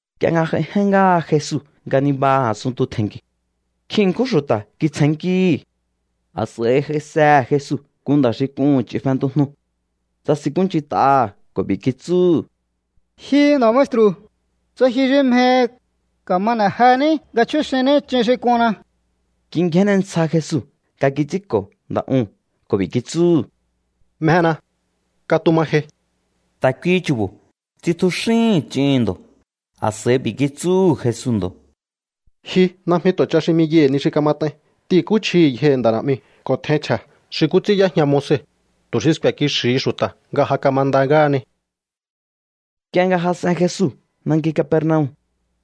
Nk'ie nga j'aijen ngáha Jesu nga nibaha a̱sunntu tje̱nki̱u̱, nkjin ṉkjún xu̱ta̱ kitsjennkíhi̱. A̱s'a̱i j'aisehe̱ Jesu nku nda̱ xi k'uhu̱n ch'in fentujnu. Tsasinkúnch'int'aha̱ ko̱ b'i̱ kitsúhu̱: —Ji nda̱ maestru̱, tsa ji xi mjehi, ka̱ma n'e̱ jení nga chjúxinní ch'in xi k'unna. Kingjénne ntsja Jesu nga kits'ínko̱ nda̱ uu̱n ko̱ b'i̱ kitsúhu̱: —Mjena. Katuma jei. Ta̱ kuihi chu̱bo̱ tsitjuxíhi̱n ch'ihi̱n ndo̱. A̱s'a̱i b'i̱ kitsúhu̱ Jesu ndo̱: —Ji najmi tu̱ ch'a xi 'miyaihi̱ ni xi kamat'ain. T'ihi̱nkúchjihi̱ yjohi̱ nda̱ na̱'miu̱ ko̱ tjein chje̱ xi nkú ts'ín y'éjña Moise, tu̱ xi sku̱e̱ kixi̱hi xu̱ta̱ nga ja kamanda ngáhani. Nk'ie nga jas'en Jesu nanki Capernaum,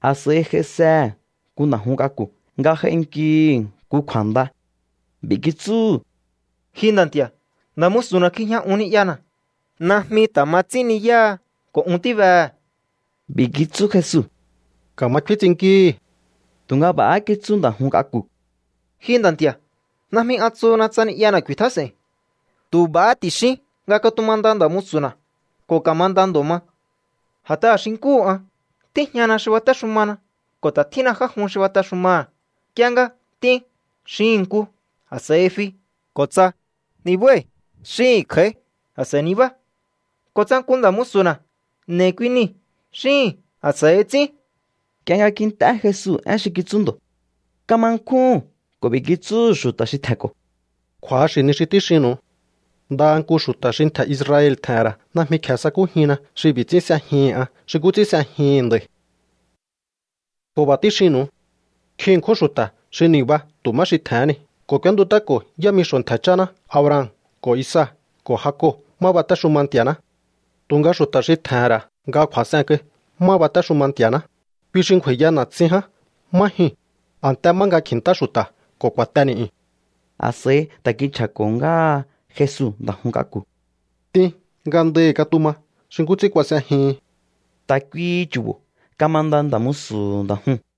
a̱s'a̱i j'aisehe̱ nku nda̱ jun k'aku̱ nga j'ainkihi̱ nku kju̱a̱nda. B'i̱ kitsúhu̱: —Ji nda̱ nti̱a̱, nda̱ musu̱na̱ kjijña un ni'yana̱. Najmi ta̱ ma ts'ín ni̱yáha ko̱ un tíbehe̱. B'i̱ kitsú Jesu: —Ka̱ma kfín ts'innkíhi̱. Tu̱nga b'a̱há kitsú nda̱ jun k'aku̱: —Ji nda̱ nti̱a̱, najmi an tsuhuna tsa ni'yana̱ ku̱i̱tjás'e̱i̱n. Tu̱ b'a̱ ti̱xín ní nga katumanda nda̱ musu̱na̱, ko̱ ka̱manda ndo̱ ma. A̱t'aha̱ xi nkúhu an, tíjñana xi batéxumana ko̱ ta̱ tjínna já jun xi batexumaha̱. Nk'ie nga: “T'in”, xihi̱n nku, a̱s'a̱i fi. Ko̱ tsa: “Nibái̱”, xíhi̱n kj'a̱í, a̱s'a̱i nibá. Ko̱ tsa nku nda̱ musu̱na̱: “N'e̱i̱ kui nii̱”, xíhi̱n, a̱s'a̱i ts'ín. Nk'ie nga kint'é Jesu én xi kitsú ndo̱, kama nkjúhu̱n ko̱ b'i̱ kitsúhu̱ xu̱ta̱ xi tje̱nko̱: —Kju̱axi̱ ni xi tíxinnu̱u. Ndaha nku xu̱ta̱ xi ntje̱ Israel tje̱he̱n ra̱ najmi kje̱e sakújinna xi b'i̱ ts'ín s'ejihi̱n an xi nkú ts'ín s'ejihi̱n nda̱i̱. Ko̱ b'a̱ tíxinnu̱u. Nkjin ṉkjún xu̱ta̱ xi ni̱ba tu̱ má xi tje̱hén ni ko̱ k'úéntut'áko̱ yámixo̱ ntje̱ cháná Abraham ko̱ Isaac ko̱ Jacob má batéxuma Nti̱a̱ná. Tu̱nga xu̱ta̱ xi tje̱he̱n ra̱ nga kju̱a̱s'en kai má batéxuma Nti̱a̱ná, kui xi ngju̱a̱i̱ya na̱tsin ján má jyuu̱n, a̱nte má nga kji̱ntá xu̱ta̱ ko̱ ku̱a̱te ni̱'yu̱n. A̱s'a̱i ta̱ kinchja̱ko̱ ngáha Jesu nda̱ jun k'aku̱: —T'in. Ngandahi̱ katuma xi nkú ts'ín kuas'ejihin. Ta̱ kuihi chu̱bo̱ kamanda nda̱ musu̱hu̱ nda̱ juu̱n.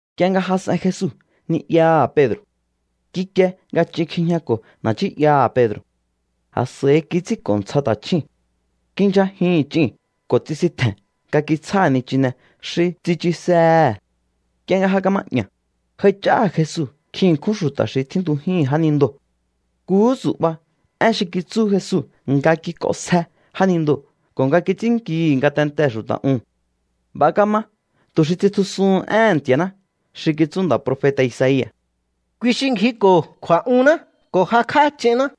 Nk'ie nga jas'en Jesu ni'yaha̱ Pedro̱, kikie nga ch'in kjijñako̱ na̱ nchí'yaha̱ Pedro̱. A̱s'a̱i kits'ínko̱ ntsja ta̱chjúu̱n. Kindyjajihi̱n ch'iu̱n ko̱ tsisintje̱n nga kitsjáha̱ nichine xi tsichusehe̱. Nk'ie nga ja kama'ña̱, j'aich'áha̱ Jesu nkjin ṉkjún xu̱ta̱ xi tjíntujíhi̱n jánindoo̱. Nkuhú tsu̱'ba én xi kitsú Jesu nga kik'onsje jánindoo̱ ko̱ nga kits'ínnkihi̱ ngatentee̱ xu̱ta̱ uu̱n. B'a̱ kama tu̱ xi tsitjusuhun éhe̱n Nti̱a̱ná xi kitsú nda̱ profeta̱ Isaia̱: “Kui xi ngjiko̱ kju̱a̱'unná ko̱ jakj'á ch'inná.”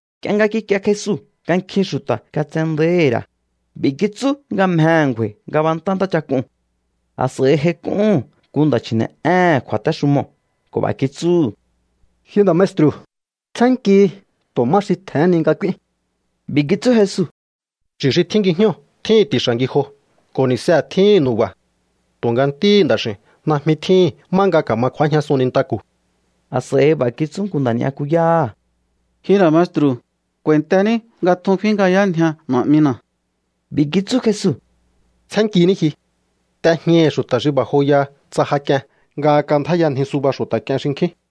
Nk'ie nga kikie Jesu nga nkjin xu̱ta̱ katsendáíhi̱ ra̱, b'i̱ kitsú nga mjehe̱ ngju̱a̱i̱ ngabantá ntáchak'uu̱n. A̱s'a̱i j'aik'úhu̱n nku nda̱ chji̱ne̱'éhe̱n kju̱a̱téxumoo̱ ko̱ b'a̱ kitsúhu̱: —Ji nda̱ maestru̱, tsjénnkihi tu̱ má xi tje̱hén ni nga k'úín. B'i̱ kitsú Jesu: —Chu̱ xi tjín ngijñóo̱ tjíhi̱n ti̱xa̱ ngijo ko̱ ni̱see̱ tjíhi̱n nu̱ba̱. Tu̱nga Ntíhi̱ Nda̱x'i̱u̱n najmi tjíhi̱n má nga ka̱ma kju̱ájñasun nintaku̱. A̱s'a̱i b'a̱ kitsú nku nda̱ ni'yakuyáha̱: —Ji nda̱ maestru̱, k'u̱a̱i̱ntení nga tjun kfínngjayánjia na̱'mina̱. B'i̱ kitsú Jesu: —Tsjénnkiní ji. T'ejñaihi̱ xu̱ta̱ xi b'a̱ joyaha tsa ja k'ien nga kandjáyanji suba xu̱ta̱ k'ien xinkjín.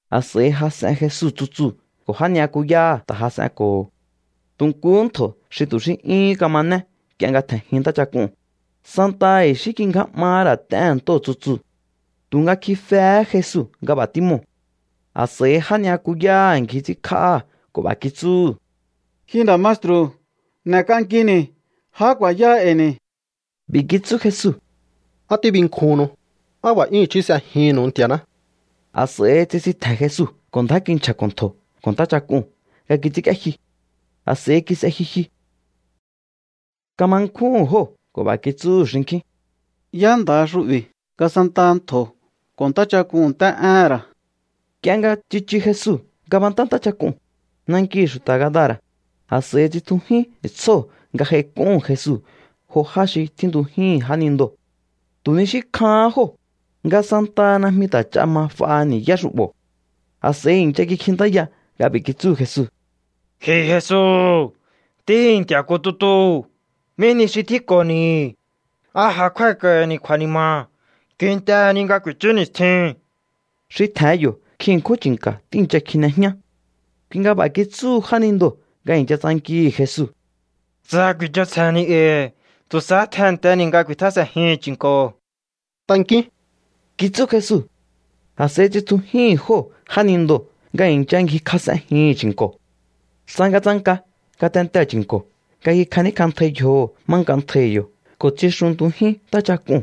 A̱s'a̱i jas'en Jesu tsutsuu̱ ko̱ já ni'yakuyáha̱ ta̱ jas'enko̱ho̱. Tu̱ nkuhú ntjo̱ xi tu̱ xí 'yúhún kamané nk'ie nga tje̱njin ntáchak'uu̱n, santaha i̱xí kingjá 'mahá ra̱ t'éhe̱n ntóo̱ tsutsuu̱. Tu̱nga kjifehé Jesu nga b'a̱ tímoo̱. A̱s'a̱i já ni'yakuyáha̱ ngji ts'ínkj'áha̱ ko̱ b'a̱ kitsúhu̱: —¡Ji nda̱ maestru̱, n'e̱k'ankini̱! ¡Ja ku̱a̱yáá e̱i̱ ni̱! B'i̱ kitsú Jesu: —¿Á tíbinkjuhunnu? ¡Á b'a̱ 'yún i̱chí s'ejihi̱nnu̱u Nti̱a̱ná! A̱s'a̱i tsisintje̱n Jesu ko̱ ndjá kinchja̱ko̱ ntjo̱ ko̱ ntáchak'uu̱n nga kits'ínk'íéjyu. A̱s'a̱i kis'e jyujyu. Kama nkjúhu̱n jóo̱ ko̱ b'a̱ kitsúhu̱ xinkjín: —¿Yá nda̱ha xu'bi̱ nga santaha ntjo̱ ko̱ ntáchak'uu̱n nt'é'éhe̱n ra̱? Nk'ie nga tsichu Jesu ngabantá ntáchak'uu̱n, nankihi̱ xu̱ta̱ Gadara̱, a̱s'a̱i tsitjujín tsjóo̱ nga j'aik'úhu̱n Jesu jo já xi tjíntujíhi̱n jánindoo̱. Tu̱ ni xí kjahán jóo̱, nga santaha najmi ta̱ ch'a ma f'a ni̱yá xu'bo̱. A̱s'a̱i i̱ncha kikjintáya nga b'i̱ kitsúhu̱ Jesu: —Ji Jesu, Ntíhi̱ Nti̱a̱ nku tutuu̱, ¿mí nihi xi tjínko̱ni̱? ¿A ja kjúái̱k'a̱i̱ni̱ kju̱a̱ni̱ma̱ kintehe̱ ni nga ku̱i̱chú ni̱stjiu̱n? Xi tje̱hen yo̱ nkjin ṉkjún chi̱nka̱ tíi̱ncha kjine jñá. Kui nga b'a̱ kitsúhu jánindoo̱ nga i̱ncha tsankihi̱ Jesu: —Tsa ku̱i̱ch'onsje̱ni̱ e̱i̱, tu̱ sahá tjennteni̱ nga ku̱i̱tjás'e̱njihi̱n chi̱nko̱. —Tankíún —kitsú Jesu. A̱s'a̱i tsitjujíhi̱n jóo̱ jánindoo̱ nga i̱ncha ngjikjas'enjihi̱n chi̱nko̱. Tsangatsanka ngatentee̱ chi̱nko̱ nga kikjaníkj'antjai yjoho̱ má nk'antjaihi̱ yo̱ ko̱ tsixuntujín ntáchak'uu̱n.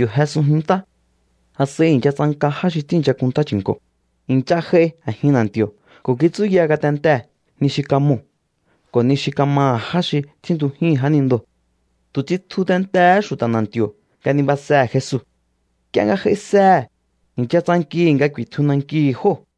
Yo̱ jesunjin ntá. A̱s'a̱i i̱ncha tsanka já xi tíi̱ncha kunntá chi̱nko̱. I̱ncha j'ai a̱jin na̱nti̱o̱ ko̱ kitsúya ngatentee̱ ni xi kamoo̱ ko̱ ni xi kamaha̱ já xi tjíntujíhi̱n jánindoo̱. Tu̱ tsitju tentehé xu̱ta̱ na̱nti̱o̱ nga nibasehe̱ Jesu. Nk'ie nga j'aisehe̱, i̱ncha tsankihi̱ nga ku̱i̱tju nankihi̱ jóo̱.